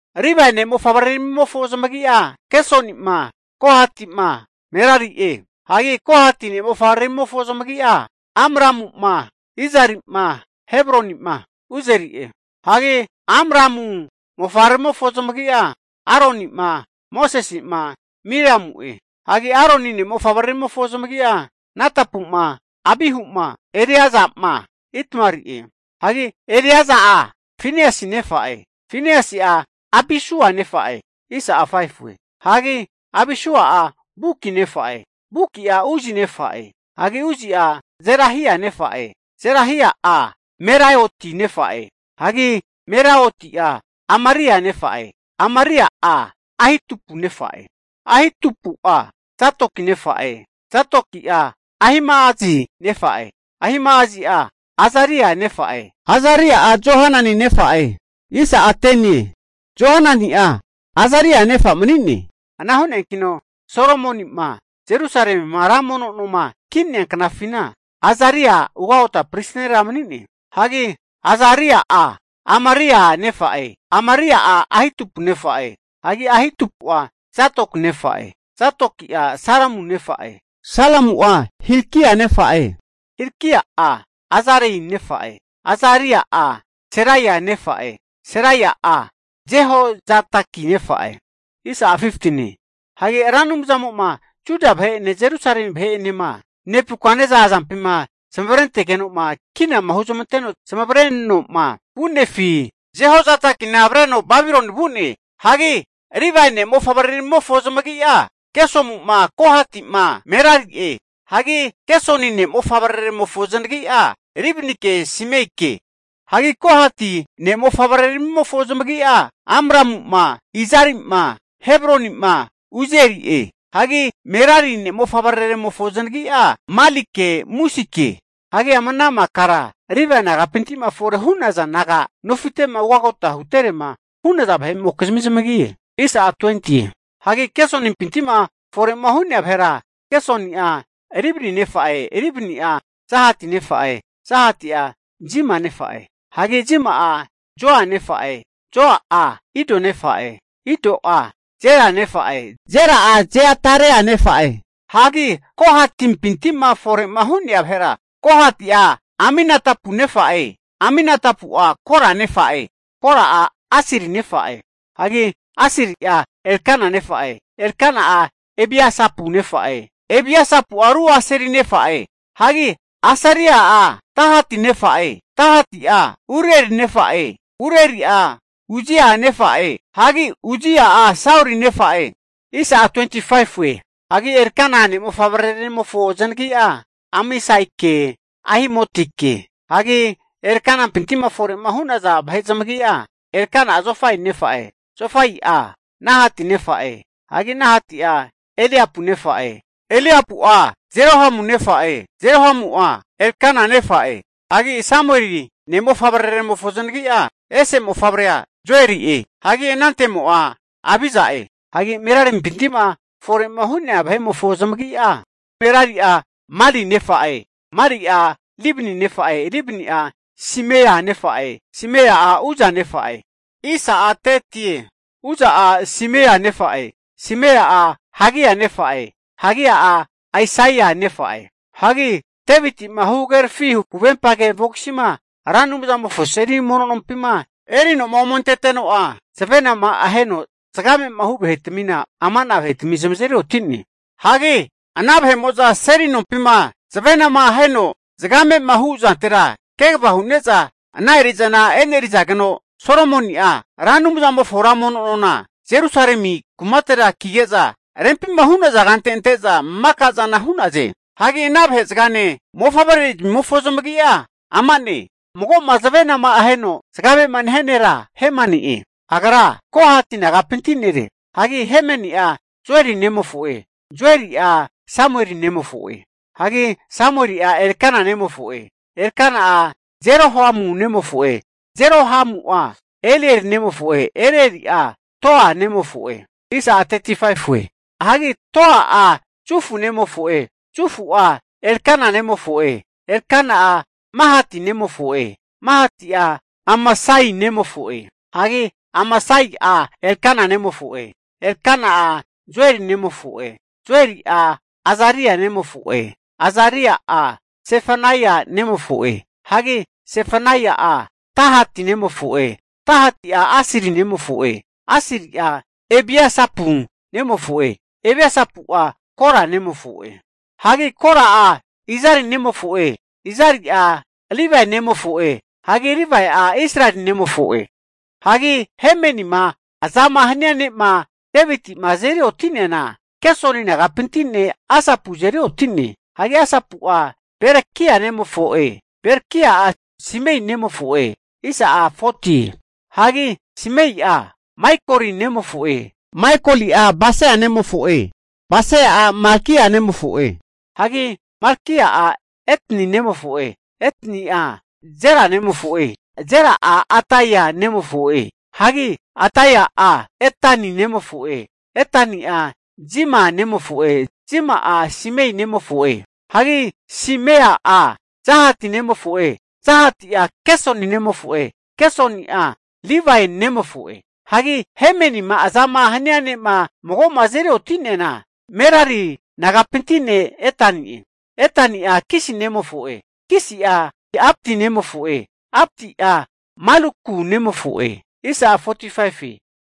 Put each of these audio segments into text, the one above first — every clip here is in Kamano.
Livae ne' mofavreramimofo zamagi'a, Gersonima, Kohati'ma, Merari'e. Hagi Kohati ne' mofavreramimofo zamagi'a, Amramu'ma, Izari'ma, Hebroni'ma, Uzieli'e. Hagi Amramu mofavreramimofo zamagi'a, Aroni'ma, Mosesi'ma, Miriamu'e. Hagi Aroni ne' mofavreramimofo zamagi'a, Nadapu'ma, Abihu'ma Eleaza'ma, Itamari'e. Hagi Eleaza'a Finiasi nefa'e, Finiasi'a Abisua nefa'e, hagi Abisua'a Buki nefa'e, Buki'a Uzi nefa'e. Hagi Uzi'a Zerahia nefa'e, Zerahia'a Meraioti nefa'e, hagi Meraioti'a Amaria nefa'e, Amaria'a Ahitupu nefa'e, Ahitupu'a Zadoki nefa'e, Zadoki'a Ahima'azi nefa'e, Ahima'azi'a Azaria nefa'e, Azaria'a Johanani nefa'e, Johanani'a Azaria nefa mani'ne. Ana hu'neakino Solomoni'ma Jerusalemima ra mono noma ki'nea knafina Azaria ugagota pristi nera mani'ne. Hagi Azaria'a Amaria nefa'e, Amaria'a Ahitupu nefa'e, hagi Ahitupu'a Zadoki nefa'e, Zadoki'a Salumu nefa'e, Salumu'a Hilkia nefa'e, Hilkia'a Azaria nefa'e, Azaria'a Seraia nefa'e, Seraia'a Jehozadaki nefa'e. Hagi Ra Anumzamo'ma Juda vahe'ene Jerusalemi vahe'enema Nebukaneza azampima zamavarentegeno'ma kinama huzmanteno zamavarenoma vu'nefi, Jehozadakina avreno Babiloni vu'ne. Hagi Livae ne' mofavreramimofo zamagi'a, Gesoni'ma, Kohatima, Merari'e. Hagi Gesoni ne' mofavreraremofo zanagi'a, Libnike, Simeike. Hagi Kohati ne' mofavreramimofo zamagi'a, Amramu'ma, Izari'ma, Hebroni'ma, Uzieli'e. Hagi Merari ne' mofavreraremofo zanagi'a, Malike, Musike. Hagi ama ana makara Livae nagapinti'ma fore hu'naza naga nofite'ma ugotama huterema hu'naza vahe'mokizmi zamagi'e. Hagi Gesonimpinti'ma fore'ma hu'nea vahera, Gesoni'a Libni nefa'e, Ribni'a Jahati nefa'e, Jahati'a Zima nefa'e, hagi Zima'a Joa nefa'e, Joa'a Ido nefa'e, Ido'a Zera nefa'e, Zera'a Jeaterai nefa'e. Hagi Kohatipinti'ma fore'ma hu'nea vahera, Kohati'a Aminadapu nefa'e, Aminadapu'a Kora nefa'e, Kora'a Asiri nefa'e, hagi Asiri'a Elkana nefa'e, Elkana'a Ebiasapu nefa'e, Ebiasapu'a ru Asiri nefa'e, hagi Asiri'a Tahati nefa'e, Tahati'a Uriel nefa'e, Urieli'a Uzia nefa'e, hagi Uzia'a Sauli nefa'e. Hagi Elkana ne' mofavreraremofo zanagi'a, Amasaike, Ahimotike. Hagi Elkanampinti'ma fore'ma hu'naza vahe zamagi'a, Elkana'a Zofai nefa'e, Zofai'a Nahati nefa'e, hagi Nahati'a Eliapu nefa'e, Eliapu'a Jerohamu nefa'e, Jerohamu'a Elkana nefa'e. Hagi Samueli ne' mofavreraremofo zanagi'a, ese mofavrea Joeli'e, hagi anante'mo'a Abija'e. Hagi Merarimpinti'ma fore'ma hu'naza vahe'mofo zamagi'a, Merari'a Mali nefa'e, Mali'a Libni nefa'e, Libni'a Simea nefa'e, Simea'a Uza nefa'e, Uza'a Simea nefa'e, Simea'a Hagia nefa'e, Hagia'a Aisaia nefa'e. Hagi Deviti'ma huhagerafi huvempage vogisima Ra Anumzamofo seli mono nompima erinoma omenteteno'a, zavenama aheno zagame'ma hu vahetmina, ama'na vahetami zamazeri oti'ne. Hagi ana vahe'amo'za seli nompima zavenama aheno zagamema hu zantera kegava hu'ne'za ana eri'zana e'nerizageno vuno Solomoni'ma Ra Anumzamofo ra mono nona Jerusalemi kumate kige'za, rempima hu'naza kante ante'za mono nompina maka zana hu'naze. Hagi ana vahezagane mofavrezmimofo zamagi'a ama'ne, mago'ma zavenama aheno zagamema nehia nera Hemani'e. Agra Kohati nagapinti nere. Hagi Hemani'a Joeli nemofo'e, Joeli'a Samueli nemofo'e, hagi Samueli'a Elkana nemofo'e, Elkana'a Jerohamu nemofo'e, Jerohamu'a Elieli nemofo'e, Elieli'a Toa nemofo'e, hagi Toa'a Zufu nemofo'e, Zufu'a Elkana nemofo'e, Elkana'a Mahati nemofo'e, Mahati'a Amasai nemofo'e. Hagi Amasai'a Elkana nemofo'e, Elkana'a Joeli nemofo'e, Joeli'a Azaria nemofo'e, Azaria'a Zefania nemofo'e, hagi Zefania'a Tahati nemofo'e, Tahati'a Asiri nemofo'e, Asiri'a Ebiasapu nemofo'e, Ebiasapu'a Kora nemofo'e. Hagi Kora'a Izari nemofo'e, Izari'a Livae nemofo'e hagi Livae'a Israeli nemofo'e. Hagi Hemanima azama hania ne'ma Deviti'ma azeri oti'neana, Gesoni nagapinti ne' Asapu azeri oti'ne. Hagi Asapu'a Bereki'a nemofo'e, Berekia'a Simea nemofo'e. Hagi Simea'a Maikoli nemofo'e, Maikoli'a Basea nemofo'e, Basea'a Malkia nemofo'e. Hagi Malkia'a Etni nemofo'e, Etni'a Zera nemofo'e, Zera'a Adaia nemofo'e. Hagi Adaia'a Etani nemofo'e, Etani'a Zima nemofo'e, Zima'a Simei nemofo'e, hagi Simei'a Jahati, nemofo'e, Jahati'a Gesoni nemofo'e, Gesoni'a Livae nemofo'e. Hagi Hemanima azama hania ne'ma mago'ma azeri oti'neana Merari nagapinti ne' Etani'e. Etani'a Kisi nemofo'e, Kisi'a Abdi nemofo'e, Abdi'a Maluku nemofo'e.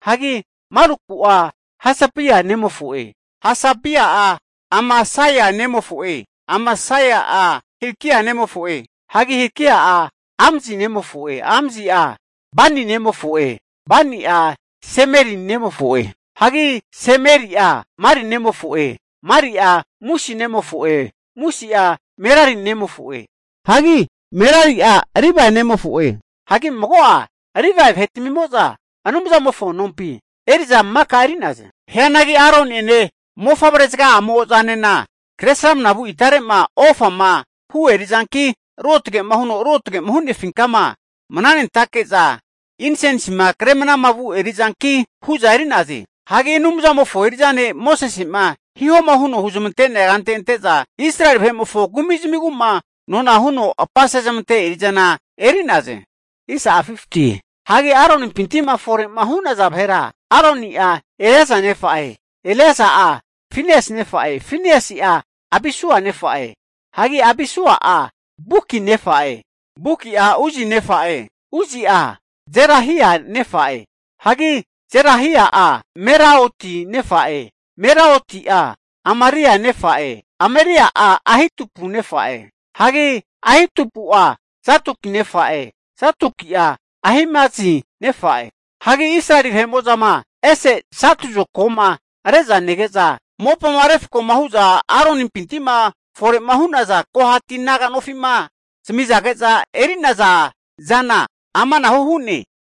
Hagi Maluku'a Hasabia nemofo'e, Hasabi'a Amasia nemofo'e, Amasia'a Hilkia nemofo'e. Hagi Hilkia'a Amzi nemofo'e, Amzi'a Bani nemofo'e, Bani'a Semeri nemofo'e. Hagi Semeri'a Mali nemofo'e, Mali'a Musi nemofo'e, Musi'a Merari nemofo'e. Hagi Merari'a Livae nemofo'e. Hagi mago'a Livae vahetamimo'za Anumzamofo nompi eri'za maka eri'naze. Hianagi Aroni'ene mofavrezaga'amo'zanena kre sramnamavu itare'ma ofama hu eri'zanki Ruotgema huno Ruotgema Hu'nefinkama mnanentake'za insensima kre mnamavu eri'zanki hu'za eri'naze. Hagi Anumzamofo eri'za ne' Mosese'ma hihoma huno huzmante'nea kante ante'za Israeli vahe'mofo kumizmiguma nona huno apasezmante eri'zana eri'naze. Hagi Aronimpinti'ma fore'ma hu'naza vahera, Aroni'a Eleaza nefa'e, Eleaza'a Finiasi nefa'e, Finiasi'a Abisua nefa'e. Hagi Abisua'a Buki nefa'e, Buki'a Uzi nefa'e, Uzi'a Zerahia nefa'e. Hagi Zerahia'a Meraioti nefa'e, Meraioti'a Amaria nefa'e, Amaria'a Ahitubu nefa'e. Hagi Ahitubu'a Zadoku nefa'e, Zadoku'a Ahimasi nefa'e. Hagi Israeli vahe'mo'zama, ese satu zokagoma re'za nege'za, mopama refkoma hu'za Aronimpinti'ma fore'ma hu'naza Kohati naga nofi'ma zami'zage'za eri'nazana amanahu hu'ne.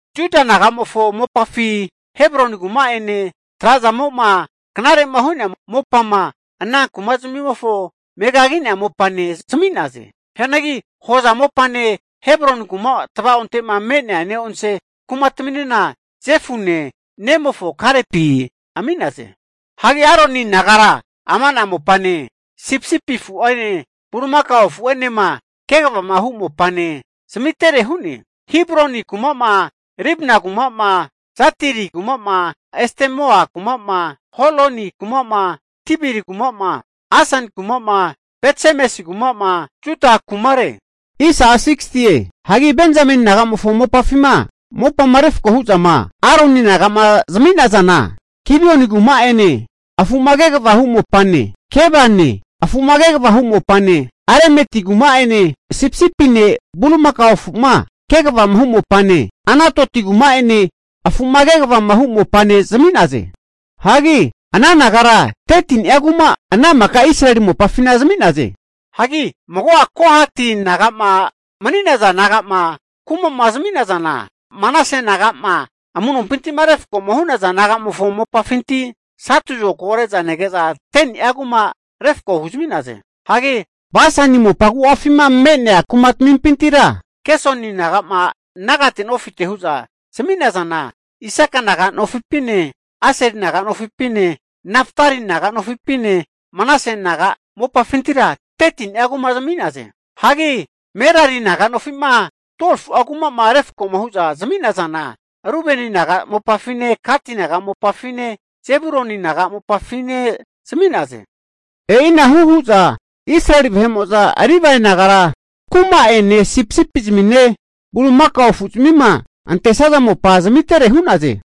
Juda naga'mofo mopafi Hebroni kuma'ene, tra'zamo'ma knare'ma hu'nea mopama ana kumamofoma megagi'nea mopane zami'naze. Hianagi hoza mopane Hebroni kuma tavaonte'ma me'nea neonse kumataminena Jefune nemofo Kalepi ami'naze. Hagi Aroni nagara ama'na mopane, sipisipi afu'ene bulimaka afu'enema kegavama hu mopa zamitere hu'ne. Hebroni kuma'ma, Libna kuma'ma, Jatiri kuma'ma, Estemoa kuma'ma, Holoni kuma'ma, Debiri kuma'ma, Asan kuma'ma, Beth-semesi kumama Juda kumare. Hagi Benzameni nagamofo mopafima, mopama refko hu'zama Aroni naga'ma zami'nazana, Gibioni kuma'ene, afu'ma kegavama hu mopane, Gebane afu'ma kegava hu mopane, Alemeti kuma'ene sipisipine bulimakao afuma kegavama hu mopane, Anatoti kuma'ene afu'ma kegavama hu mopane zami'naze. Hagi ana nagara 13ni'a kuma ana maka Israeli mopafina zami'naze. Hagi mago'a Kohati naga'ma mani'naza naga'ma kumama zami'nazana, Manase naga'ma amu'nompintima refkoma hu'naza nagamofo mopafinti satu zokago re'za nege'za 10ni'a kuma refko huzami'naze. Hagi Basani mopa agu'afima me'nea kumatamimpintira Gesoni nagama, nagate nofite hu'za zami'nazana, Isaka naga mopafine, Aseli naga mopafine, Naftali naga mopafine, Manase naga mopafintira 13ni'a kuma zami'naze. Hagi Merari naga nofima 12fu'a kuma'ma refkoma hu'za zami'nazana, Rubeni naga mopafine, Gati naga mopafine, Zebuluni naga mopafine zami'naze. E'ina hu hu'za Israeli vahe'mo'za Livae nagara kuma'ene, sipisipizmine bulimakao afu'zmima antesaza mopa zamitere hu'naze.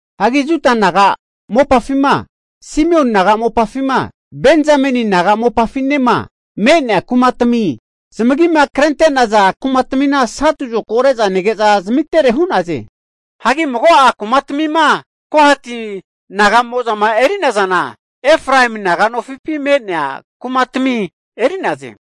Hagi Juda naga mopafima, Simioni naga mopafima, Benzameni naga mopafinema, me'nea kumatamima zamagima krente'naza kumatamina satu zokago re'za nege'za, zamitere hu'naze. Hagi mago'a kumatamima Kohati naga'mo'zama eri'nazana, Efraemi naga mopafi me'nea kumatami eri'naze.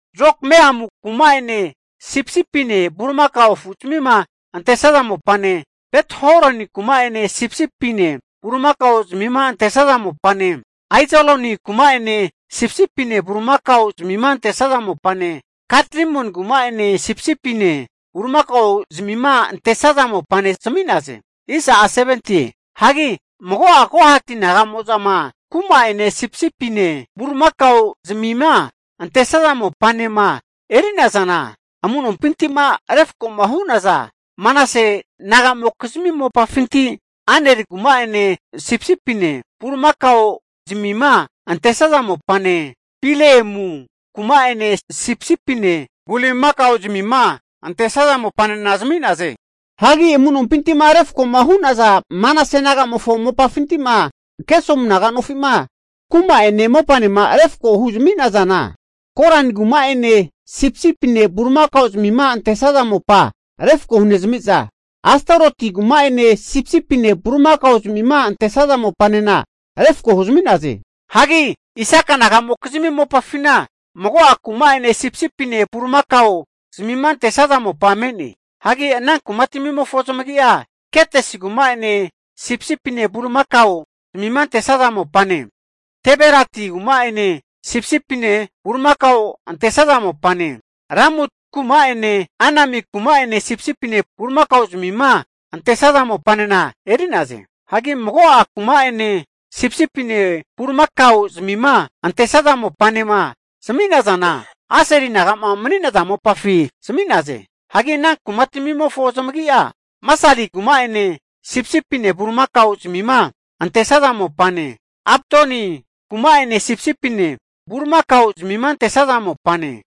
Jokmeamu kuma'ene sipisipine bulimakao afu'zamima antesaza mopane, Bet-horoni kuma'ene sipisipine bulimakao zamima antesaza mopane, Aijaloni kuma'ene sipisipine bulimakao zamima antesaza mopane, Gat-rimoni kuma'ene sipisipine bulimakao zamima antesaza mopa zami'naze. Hagi mago'a Kohati naga'mo'zama kuma'ene sipisipine bulimakao zamima antesaza mopanema eri'nazana, amu'nompintima refkoma hu'naza Manase nagamokizmi mopafinti Aneri kuma'ene sipisipine bulimakao zmima antesaza mopane, Bileamu kuma'ene sipisipine bulimakao zmima antesaza mopanena zami'naze. Hagi amu'nompinti'ma refko'ma hu'naza Manase nagamofo mopafinti'ma Gesomu naga nofi'ma kuma'ene mopanema refko huzami'nazana Gorani kuma'ene sipisipine bulimakao zamima antesaza mopa refko hunezamiza, Astaroti kuma'ene sipisipine bulimakao zamima antesaza mopanena refko huzami'naze. Hagi Isaka nagamokizmi mopafina mago'a kuma'ene sipisipine bulimakao zamima antesaza mopa me'ne. Hagi ana kumatmimofo zamagi'a, Kedesi kuma'ene sipisipine bulimakao zamima antesaza mopane, Daberati kuma'ene sipisipine bulimakaoma antesaza mopane, Ramoti kuma'ene Anemi kuma'ene sipisipine bulimakao zamima antesaza mopanena eri'naze. Hagi mago'a kuma'ene sipisipine bulimakao zamima antesaza mopanema zami'nazana, Aseli naga'ma mani'naza mopafi zami'naze. Hagi ana kumatmimofo zamagi'a, Masali kuma'ene sipisipine bulimakao zmima antesaza mopane, Abdoni kuma'ene sipisipine bulimakao'zmima antesaza mopane,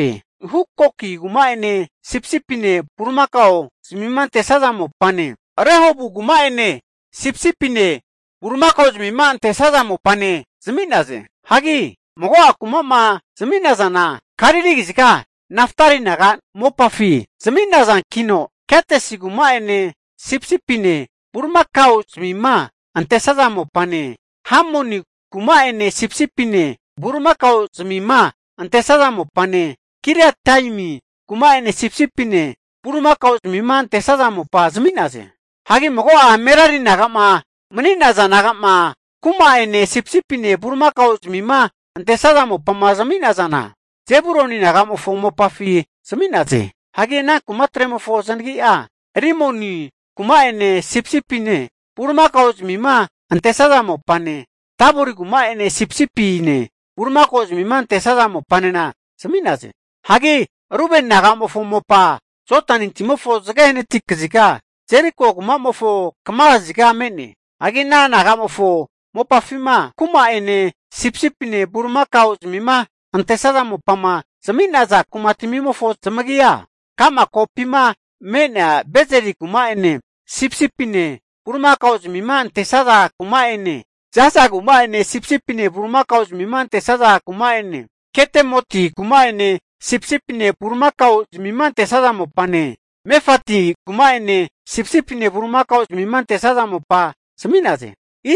Hukoki kuma'ene sipisipine bulimakao'zmima antesa mopane, Rehobu kuma'ene sipisipine bulimakao'zmima antesaza mopane zami'naze. Hagi mago'a kumama zami'nazana, Galili kaziga Naftali naga mopafi zami'nazankino, Kedesi kuma'ene sipisipine bulimakao zmima antesaza mopane, Hamoni kuma'ene, sipisipine bulimakao zamima antesaza mopane, Kiriataimi kuma'ene sipisipine bulimakao zmima antesaza mopa zami'naze. Hagi mago'a Merari naga'ma maniza naga'ma kuma'ene sipisipine bulimakao zmima antesaza mopa zami'nazana, Zebuluni nagamofo mopafi zami'naze. Hagi ana kumatremofo zanagi'a, Rimono kuma'ene sipisipine bulimakao zmima antesaza mopane, Tabori kuma'ene sipisipine bulimakao zamima antesaza mopanena zami'naze. Hagi Rubeni nagamofo mopa Jodani timofo zage hanati kaziga Jeriko kuma'mofo kama kaziga me'ne. Hagi ana naga'mofo mopafima kuma'ene sipisipine bulimakao zamima antesaza mopama zami'naza kumatamimofo zamagia, ka'ma kopima me'nea Bezeri kuma'ene sipisipine bulimakao zmima antesaza mopane Jaza kuma'ene sipisipine bulimakaozmima antesaza mopane, Kedemoti kuma'ene sipisipine bulimakao zmima antesaza mopane, Mefati kuma'ene sipisipine bulimakao zmima antesaza mopane zami'naze.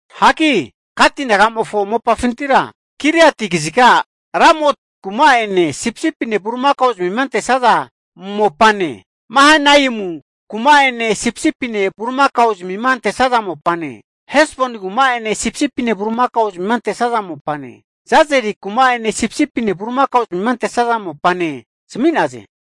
Hagi Gati nagamofo mopafintira Giliati kaziga Ramoti kuma'ene sipisipine bulimakao zmima antesaza mopane, Mahanaimu kuma'ene sipisipine bulimakao zmima antesaza mopane, Hesboni kuma'ene sipisipine bulimakao zmima antesaza mopane, Jazeri kuma'ene sipisipine bulimakao zmima antesaza mopane, zami'naze.